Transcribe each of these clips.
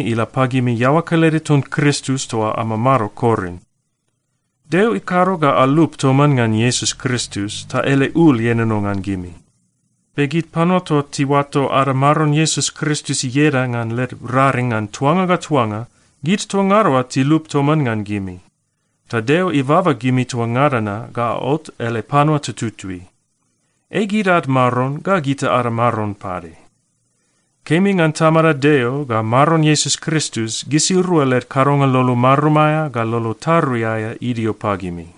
ila pagimi iaoa kelede ton Kristus toa amamado Korin. Deo ikado ga alup toman ngan Iesus Kristus ta ele ul ienono ngan gimi. Be gid panua toa tiuato ada Maron Iesus Kristus ieda ngan led raring ngan tuanga ga tuanga, gid toa ngada oa tilup toman ngan gimi, ta Deo ibaba gimi toa ngada na ga aot ele panua tututui. Ei gid ad Maron ga gita ada Maron pade. Kemi ngan Tamada Deo ga Maron Iesus Kristus, gisirua led kadonga lolo marum aea ga lolo tarui aea idio pagimi.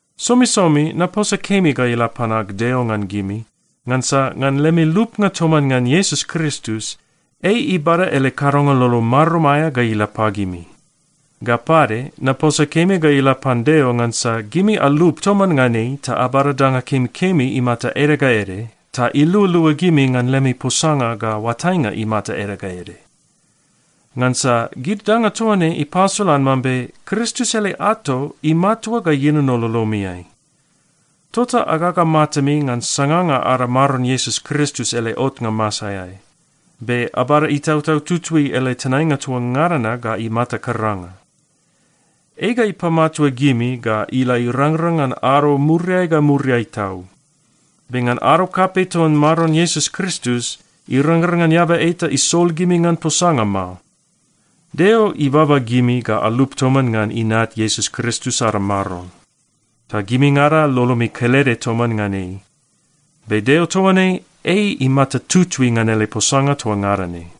Somisomi naposa kemi ga ila pan ag Deo ngan gimi, ngansa ngan lemi lupnga toman ngan Iesus Kristus, ei ibada ele kadonga lolo marum aea ga ila pagimi. Ga pade, naposa kemi ga ila pan Deo ngansa gimi alup toman ngan ei ta abada danga kemikemi imata ede ga ede, ta ilualua gimi ngan lemi posanga ga oatainga imata ede ga ede. Ngansa gid danga toa ne ipasolan mambe Kristus ele ato imatua ga ienono lolomiai. Tota agaga matami ngan sanganga ada Maron Iesus Kristus ele otnga masaeai, be abada Itautau Tutui ele tenainga toa ngada na ga imata karanga. Ei ga ipamatua gimi ga ila irangrang ngan ado muriai ga muriai tau. Be ngan ado kapei ton Maron Iesus Kristus, irangrang ngan eaba eta isol gimi ngan posanga mao. Deo ibaba gimi ga alup toman ngan Inat Iesus Kristus ada Maron, ta gimingada lolomi kelede toman ngan ei. Be Deo toa ne ei imata tutui ngan ele posanga toa ngada ne.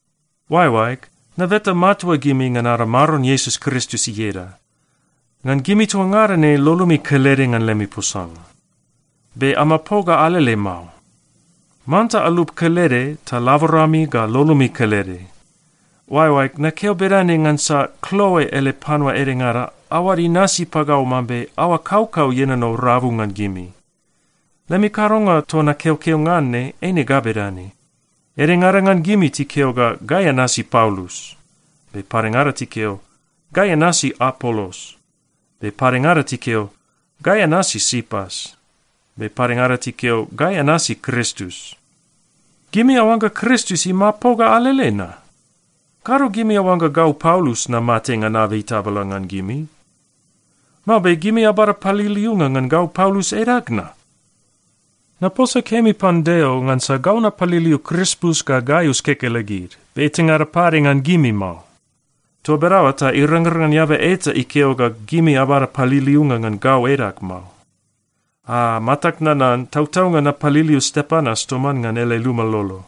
Oaeoaeg, nabeta matua gimi ngan ada Maron Iesus Kristus ieda, ngan gimi toa ngada ne lolomi kelede ngan lemi posanga. Be amapoga alele mao. Manta alup kelede ta laborami ga lolomi kelede. Oaeoaeg, nakeo bedane ngansa Kloe ele panua edengada aoad inasi pagau mambe aoa kaukau ienono rabu ngan gimi. Lemi kadonga toa nakeokeo ngan ne eine ga bedane: Edengada ngan gimi tikeo ga, “Gai anasi Paulus,” be padengada tikeo, “Gai anasi Apolos,” be padengada tikeo, “Gai anasi Sipas,” be padengada tikeo, “Gai anasi Kristus.” Gimi aoangga Kristus imapoga alele na? Kado gimi aoangga gau Paulus namate ngan abei tabala ngan gimi? Mao be gimi abada paliliunga ngan gau Paulus edag na? Naposa kemi pan Deo ngansa gau napaliliu Krispus ga Gaius kekelegid, be etangada pade ngan gimi mao. Toa bedaoa ta irangrang ngan eaba eta ikeo ga gimi abada paliliunga ngan gau edag mao. (Aa, matag nanan, tautaunga napaliliu Stepanas toman ngan ele luma lolo,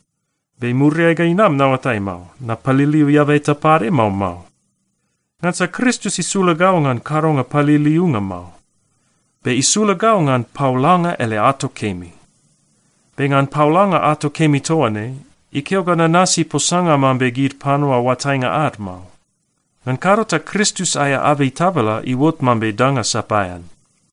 be muriai ga inam naoatai mao, napaliliu eaba eta pade, mao mao.) Ngansa Kristus isula gau ngan kadonga paliliunga mao, be isula gau ngan paolanga ele ato kemi. Be ngan paolanga ato kemi toa ne, ikeo ga nanasi posanga mambe gid panua oatainga ad mao. Ngan kado ta Kristus aea abei tabala iuot mambe danga sapaean.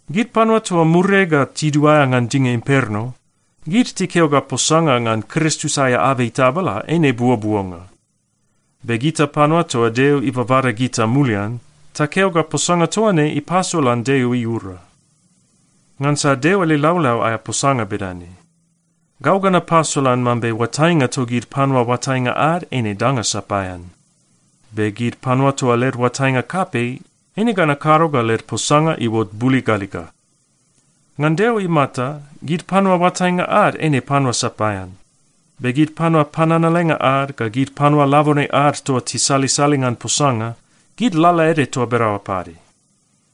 Gid panua toa muriai ga tiduaea ngan dinga imperno, gid tikeo ga posanga ngan Kristus aea abei tabala eine buobuonga. Be gita panua toa Deo ibabada gita mulian, takeo ga posanga toa ne ipasolan Deo iura. Ngansa Deo ele laulau aea posanga bedane, “Gau ga napasolan mambe oatainga togid panua oatainga ad, eine danga sapaean. Be gid panua toa led oatainga kapei, eine ga nakado ga led posanga iuot buligaliga.” Ngan Deo imata, gid panua oatainga ad eine panua sapaean. Be gid panua pananalenga ad ga gid panua labone ad toa tisalisali ngan posanga, gid lalaede toa bedaoa pade.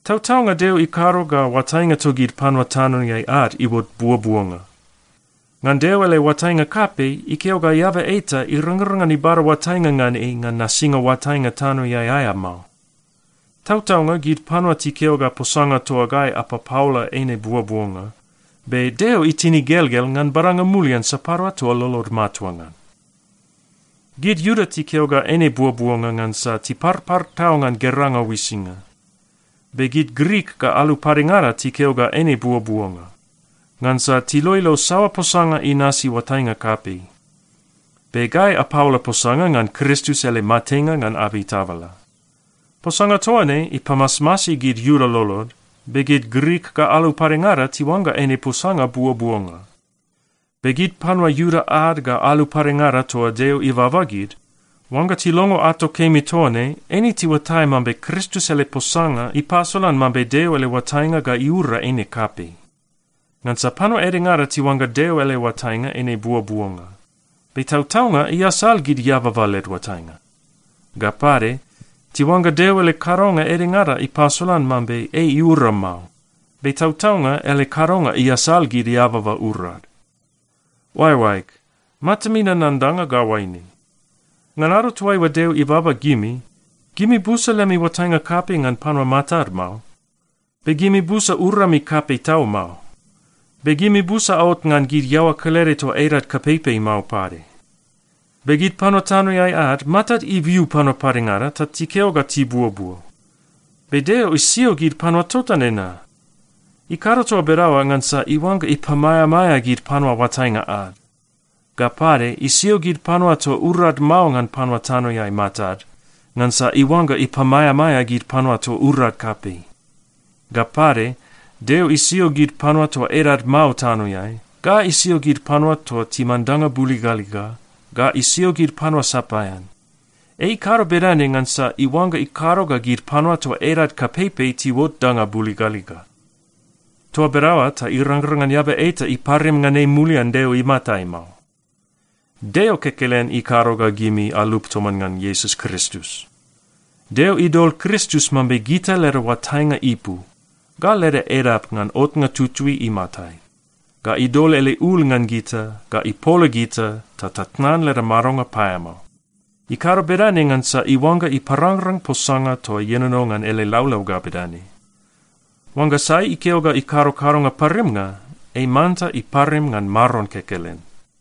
Tautaunga Deo ikado ga oatainga togid panua tanoeai ad iuot buobuonga. Ngan Deo ele oatainga kapei, ikeo ga eaba eta irangrang ngan ibada oatainga ngan ei ngan nasinga oatainga tanoeai aea mao. Tautaunga, gid panua tikeo ga posanga toa gai apapaola eine buobuonga, be Deo itin igelgel ngan badanga mulian sapadua toa lolod matua ngan. Gid Iuda tikeo ga eine buobuonga ngansa tiparpar tau ngan geranga uisinga. Be gid Grik ga alu padengada tikeo ga eine buobuonga, ngansa tiloilo saoa posanga inasi oatainga kapei. Be gai apaola posanga ngan Kristus ele matenga ngan abei tabala. Posanga toa ne ipamasmasi gid Iuda lolod, be gid Grik ga alu padengada tiuangga eine posanga buobuonga. Be gid panua Iuda ad ga alu padengada toa Deo ibaba gid, oangga tilongo ato kemi toa ne, eine tiuatai mambe Kristus ele posanga ipasolan mambe Deo ele oatainga ga iura eine kapei. Ngansa panua edengada tiuangga Deo ele oatainga eine buobuonga, be tautaunga iasal gid eababa led oatainga. Ga pade, tiuangga Deo ele kadonga edengada ipasolan mambe ei iura mao, be tautaunga ele kadonga iasal gid eababa urad. Oaeoaeg, matami nanan danga ga oaine: Ngan ado toaiua Deo ibaba gimi, gimi busa lemi oatainga kapei ngan panua matad mao, be gimi busa urami kapei tau mao, be gimi busa aot ngan gid iaoa kelede toa edad kapeipei mao pade. Be gid panua tanoeai ad, matad ibiu panua padengada ta tikeo ga tibuobuo. Be Deo isio gid panua tota nena. Ikado toa bedaoa ngansa iuangga ipamaeamaea gid panua oatainga ad. Ga pade, isio gid panua toa urad mao ngan panua tanoeai matad, ngansa iuangga ipamaeamaea gid panua toa urad kapei. Ga pade, Deo isio gid panua toa edad mao tanoeai, ga isio gid panua toa timan danga buligaliga, ga isio gid panua sapaean. Ei ikado bedane ngansa iuangga ikado ga gid panua toa edad kapeipei tiuot danga buligaliga. Toa bedaoa ta irangrang ngan eaba eta iparim ngan ei mulian Deo imatai mao. Deo kekelen ikado ga gimi alup toman ngan Iesus Kristus. Deo idol Kristus mambe gita leda oatainga ipu, ga leda edap ngan otnga tutui imatai, ga idol ele ul ngan gita, ga ipola gita ta tatnan leda madonga paeamao. Ikado bedane ngansa iuangga iparangrang posanga toa ienono ngan ele laulau ga bedane, “Oangga sai ikeo ga ikado kadonga parimnga, ei manta iparim ngan Maron kekelen.”